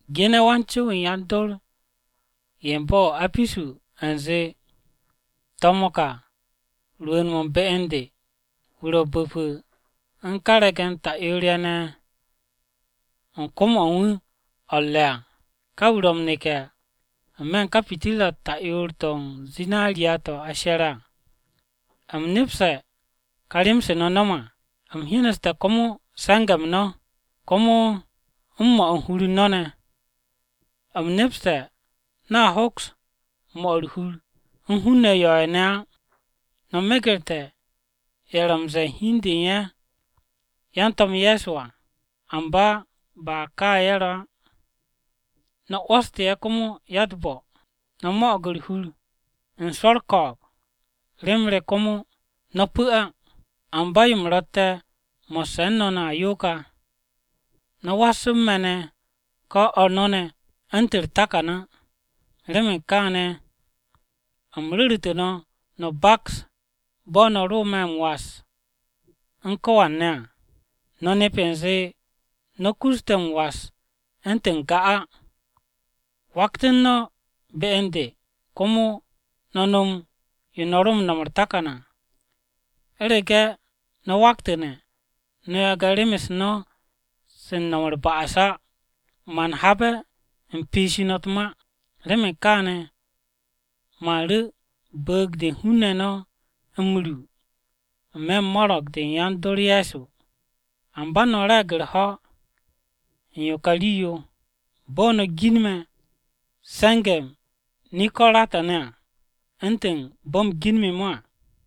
“Gene̱ wan-co-wu̱ u̱n yan-dor ye̱ u̱n bo̱-o̱ o-Apisu u̱nze: To̱m-o̱ ka rwu̱u̱n-mo̱ u̱n be u̱n de, wu̱ ro̱ bu̱pu̱ u̱n ka re̱ge̱n ta'yoor-ye̱ ne̱ u̱n kom-o̱ u̱n wu̱ o̱ u̱r-re̱ à, ka wu̱ ro̱ m-neke̱ n-me̱ u̱n ka pitirra-u̱t ta'yoor-to̱ o-zinariya to̱ a she̱re̱ à. U̱m nepste̱ ka rem-se no̱ no̱me̱ à. U̱m hyeneste̱ komo se̱nge̱-m no̱, komo u̱n 'mo̱ u̱r-hur u̱n no̱ ne̱. U̱m nepste̱ no̱a hoks 'mo̱ u̱r-hur u̱n hun-ne̱ yo̱-ye̱ ne̱ á. No̱ megerte̱ ye̱ ro̱ m-ze̱e̱ u̱n hi u̱n de u̱n ye̱ yan-To̱m Ye̱so à, amba ba kaane̱ ye̱ ro̱ á. No̱ 'wo̱stu̱ ye̱ komo ya-u̱t-bo̱. No̱ mo̱'o̱g u̱r-hur u̱n swo̱ u̱r-ko̱o̱b rem re komo no̱ pu̱ á. Amba yo u̱m ro̱tte̱ mo̱sse̱ u̱n no̱ ne̱ à yo ka: No̱ was u̱n me̱ ne̱ ko̱ o̱r no̱ ne̱ u̱ntu̱n u̱r-takan á. Remen kaane̱, u̱m ru̱ru̱te̱ no̱ no̱ baks bo̱ no̱ ro me̱ m-was u̱n ko̱wan ne̱ à, no̱ nep u̱nze no̱ kus te̱ m-was u̱ntu̱n n-ga á! Waktu̱ u̱n no̱ be u̱n de komo no̱ nom yo no̱ ro no̱m u̱r-takan à. U̱rege̱ no̱ waktu̱ne̱, no̱ yagne̱ rem-u̱s no̱ se u̱r-ba'as á, man habe̱ u̱m piishi no̱ u̱t-ma. Remen kaane̱ man ru̱ bu̱u̱g-de u̱n hun-ne̱ no̱ m-ru n-me̱ u̱n mo̱ro̱g-de yan-dor Ye̱so. Amba no̱ re̱e̱g u̱r-ho̱ u̱n yo ka rii-yo: bo̱ no̱ ginme̱ se̱nge̱-m Nikorata-ne̱ u̱ntu̱n bo̱ u̱m ginme̱-mo̱ à.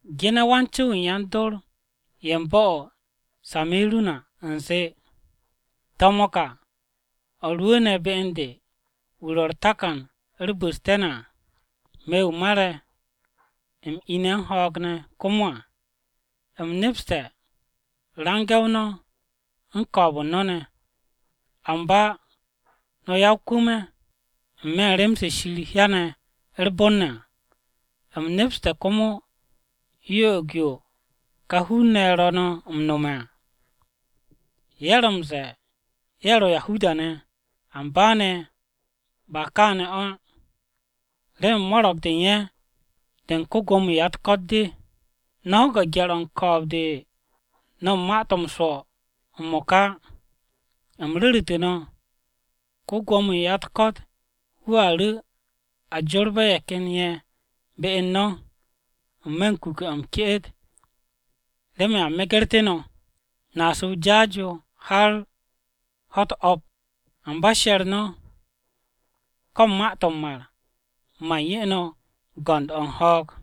“Gene̱ wan-co-wu̱ u̱n yan-dor ye̱ u̱n bo̱-o̱ o-Se̱miru̱na u̱nze: To̱m-o̱ ka o̱ rwu̱u̱ne̱ be u̱n de, wu̱ ro̱ u̱r-Takan u̱r-Bu̱ste̱ ne̱ à; Me̱ wu̱ mare̱, u̱m ine̱ m-ho̱o̱g ne̱ komo à. U̱m nepste̱ range̱-o no̱ u̱n ko̱o̱b u̱n no̱ ne̱. Amba no̱ ya-o-kwu̱m-ye̱ n-me̱ u̱n rem-se Shir hyane̱ u̱r-bon ne̱ à. U̱m nepste̱ komo yo'og-yo ka hun-ne̱ ye̱ ro̱ no̱ m-no̱me̱ à. Ye̱ ro̱ m-ze̱e̱ ye̱ ro̱ Yahuda-ne̱, amba ne̱ ba kaane̱ o̱ á, remen mo̱ro̱g-de u̱n ye̱ de u̱n ko-Gwo̱mo-wu̱ u̱n ya-u̱t-ko̱t de. No̱ ho̱ge̱ gye̱r-o̱ u̱n ko̱o̱b-de no̱ u̱n ma-to̱ m-swo̱ m-mo̱ka á. U̱m ru̱ru̱tu̱ no̱, ko-Gwo̱mo-wu̱ u̱n ya-u̱t-ko̱t wu̱a ru̱ a jorbe̱ ye̱ ken ye̱ be u̱n no̱ n-me̱ u̱n kuke̱-o̱ m-ke'et remen a megerté̱ no̱. No̱a su̱ o-jaas yo har ho̱-u̱t o̱p. Amba she̱r no̱, ko̱ u̱n ma-to̱ m-mar, man 'ye no̱ go̱nd-o̱ u̱n ho̱o̱g.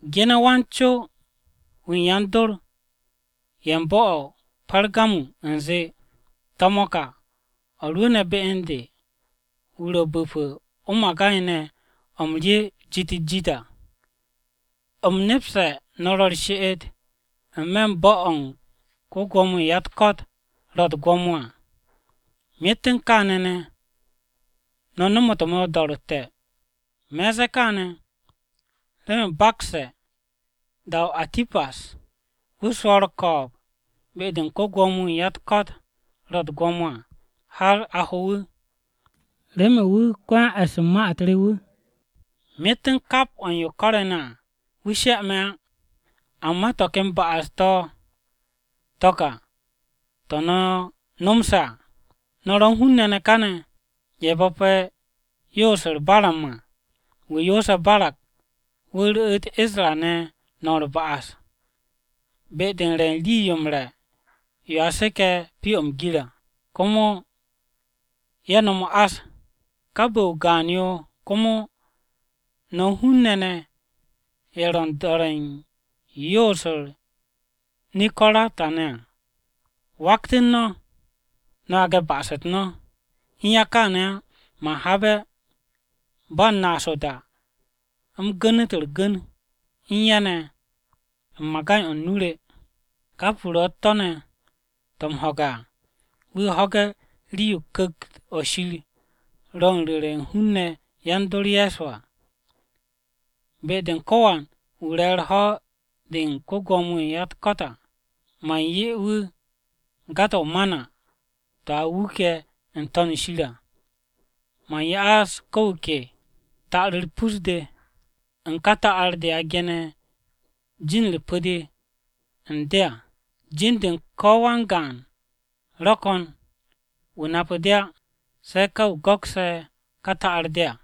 “Gene̱ wan-co-wu̱ u̱n yan-dor ye̱ u̱n bo̱-o̱ o-Pergamu u̱nze: To̱m-o̱ ka o̱ rwu̱u̱ne̱ be u̱n de, wu̱ ro̱ bu̱pu̱ o-magay ne̱ o̱ m-rye de̱e̱n jit-u̱t-jit à. U̱m nepste̱ no̱ ro̱ u̱r-she'et n-me̱ u̱n bo̱-o̱ u̱n ko-Gwo̱mo-wu̱ u̱n ya-u̱t-ko̱t ro̱ u̱t-gwo̱mo à. Myet u̱n kaane̱ ne̱, no̱ nomote̱ me̱ o-do̱ro̱tte̱. Me̱ u̱n ze̱e̱ kaane̱ remen u̱m bakste̱ da-o Antipas, wu̱ swo̱o̱g u̱r-ko̱o̱b be-de u̱n ko-Gwo̱mo-wu̱ u̱n ya-u̱t-ko̱t ro̱ u̱t-gwo̱mo à har a ho wu̱, remen wu̱ ko-yan-e̱sse̱ ma-u̱t re wu̱. Myet u̱n kap o̱ u̱n yo ko̱re̱ ne̱ à, wu̱ she me̱ á. Amba to̱ ken ba'as-to̱ to̱ ka to̱ no̱ no̱mse̱ à: No̱ ro̱ u̱n hun-ne̱ ne̱ káane̱ ye̱ bo̱pe̱ yoos-u̱r Baram à, wu̱ yoose̱ Barak wu̱ ru̱'u̱t Isra-ne̱ no̱m u̱r-ba'as, be-de u̱n re u̱n rii-yo m-re̱ yo a seke̱ pyo-o̱ m-gir à, komo ye̱ nom o-ás. Ka bu̱-o o-gaan yo komo no̱ u̱n hun-ne̱ ne̱ ye̱ ro̱ u̱n do̱re̱ u̱n yoos-u̱r Nikorata-ne̱ à. Waktu̱n no̱, no̱ yage̱ ba'as-u̱t no̱! U̱n ya kááne̱ á, man habe̱ ba u̱n naas o-da u̱m gu̱nu̱t u̱r-gu̱n u̱n ye̱ ne̱ u̱n magay-o̱ nu-o re. Kap wu̱ ro̱ u̱t-tó̱ ne̱ to̱ m-ho̱ge̱ à, wu̱ ho̱ge̱ rii-yo Ku̱kt-o Shir ro̱ u̱n ru̱re̱ u̱n hun-ne̱ yan-dor Ye̱so à! Be-de u̱n ko̱wan wu̱ re̱ u̱r-ho̱ de u̱n ko-Gwo̱mo-wu̱ u̱n ya-u̱t-ko̱t à, man 'ye wu̱ ga-to̱ o-Mana to̱ a wuke̱ n-To̱n shir à. Man ya'as ko̱ wu̱ ke ta'ar-u̱r pus-de u̱n ka ta'ar-de a gene̱ jin-u̱r pu̱-de n-to̱n u̱n de, jin-de ko̱ wan-gaan-wu̱ ro̱ ko̱n, wu̱ nape̱ de á, se̱ ka wu̱ go̱kse̱ ka ta'ar-de à.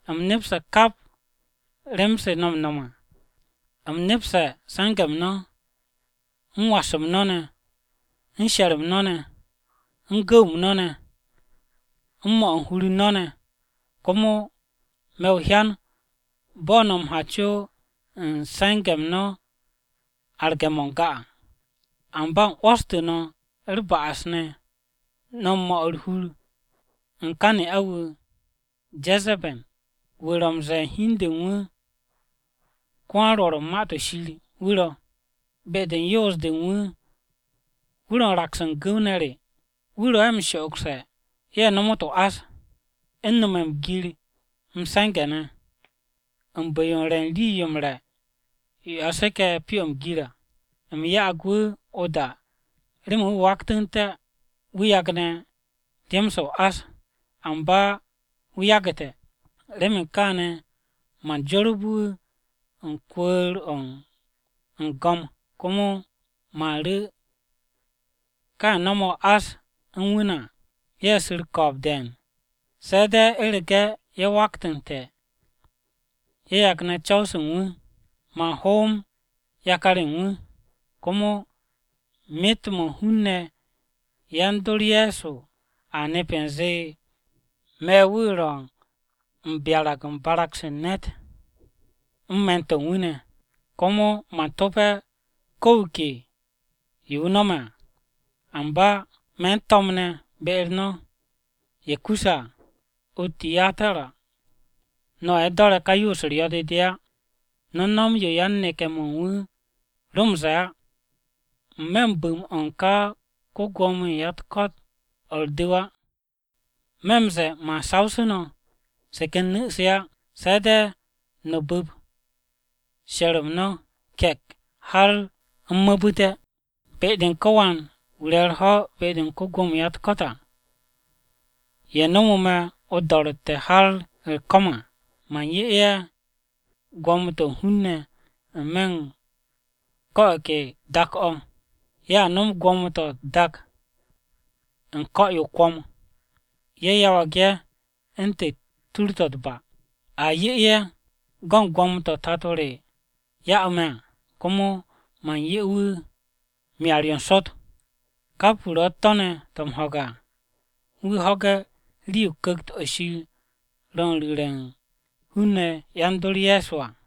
U̱m nepste̱ kap rem-se no̱ m-no̱m à. U̱m nepste̱ se̱nge̱-m no̱, u̱n was-m no̱ ne̱, u̱n she̱r-m no̱ ne̱, u̱n gu̱w-m no̱ ne̱, u̱n 'mo̱ u̱n hur u̱n no̱ ne̱. Komo me̱ m-hyan bo̱ no̱ m-ha co u̱n se̱nge̱-m no̱ arge̱-mo̱ n-ga à. Amba u̱m 'wo̱stu̱ no̱ u̱r-ba'as ne̱, no̱ u̱n 'mo̱ u̱r-hur u̱n ka ne'a-wu̱ ne̱ Je̱ze̱be̱n, wu̱ ro̱ m-ze̱e̱ u̱n hi u̱n de u̱n wu̱ ‘ko-wan-Rwo̱r u̱n Ma-to̱ Shir’ wu̱ ro̱. Be-de u̱n yoos-de u̱n wu̱, wu̱ ro̱ u̱n raks u̱n gu̱w-ne̱ re. Wu̱ ro̱ ye̱ m-sho'ogse̱ ye̱ nomot o-ás, u̱n nome̱ m-gir m-se̱nge̱ ne̱, u̱n bu̱-yo u̱n re̱ u̱n rii-yo m-re̱ yo a seke̱ pyo-o̱ m-gir à. U̱m ya'ag wu̱ o-da remen wu̱ waktu̱nté̱ wu̱ yagne̱ rem-se o-ás, amba wu̱ yagu̱te̱. Remen kaane̱ man jorbe̱ wu̱ u̱n kwu̱u̱r-o̱ u̱n go̱m, komo man ru̱ ka ye̱ no̱me̱ o-ás u̱n wu̱ ne̱ à ye̱ su̱ u̱r-ko̱o̱b de̱e̱n, se̱ de̱ u̱rege̱ ye̱ waktu̱nte̱ ye̱ yagne̱ co̱w-se u̱n wu̱. Man hoom yakar-ye̱ u̱n wu̱. Komo myet-mo̱ u̱n hun-ne̱ yan-dor Ye̱so a nep u̱nze, me̱ wu̱ ro̱ m-byarag u̱n barag-se u̱n ne̱t u̱n me̱n-to̱ u̱n wu̱ ne̱. Komo man to̱pe̱ ko̱ wu̱ ke yo wu̱ no̱me̱ à. Amba me̱ u̱n to̱mne̱ be-u̱r no̱ ye̱ kusse̱ à o-Tiyatira no̱ ye̱ do̱re̱ ka yoos-u̱r yo̱-de de á. No̱ no̱m yo yan-neke̱-mo̱ u̱n wu̱ ro̱ m-ze̱e̱ á, n-me̱ u̱n bu̱m-o̱ u̱n ko-Gwo̱mo-wu̱ u̱n ya-u̱t-ko̱t o̱ u̱r-du̱w á. Me̱ no̱ m-ze̱e̱, man sawsu̱ no̱ se ken nu̱-se á. Se̱ de̱ no̱ bu̱p she̱r-m no̱ ke̱k har u̱m m-mu̱bu̱te̱. Be-de u̱n ko̱wan wu̱ re̱ u̱r-ho̱ de u̱n ko-Gwo̱mo-wu̱ u̱n ya-u̱t-ko̱t à, ye̱ nomo me̱ o-do̱ro̱tte̱ har u̱r-ko̱m à, man 'ye ye̱ gwo̱mo-to̱ u̱n hun-ne̱ n-me̱ u̱n ko̱ o̱ ke dak-o̱. ‘Ye̱ a nom gwo̱mo-to̱ u̱t-dak u̱n ko̱-yo o-kwo̱m; ye̱ yawag ye̱ u̱ntu̱n tur-to̱ u̱t-ba.’ A 'ye ye̱ go̱n gwo̱mo-to̱ Tato re ya'u̱ me̱ à. Komo man 'ye wu̱ Myar-yo n-Sot! Kap wu̱ ro̱ u̱t-tó̱ ne̱ to̱ m-ho̱ge̱ à, wu̱ ho̱ge̱ rii-yo Ku̱kt-o Shir ro̱ u̱n ru̱re̱ u̱n hun-ne̱ yan-dor Ye̱so à!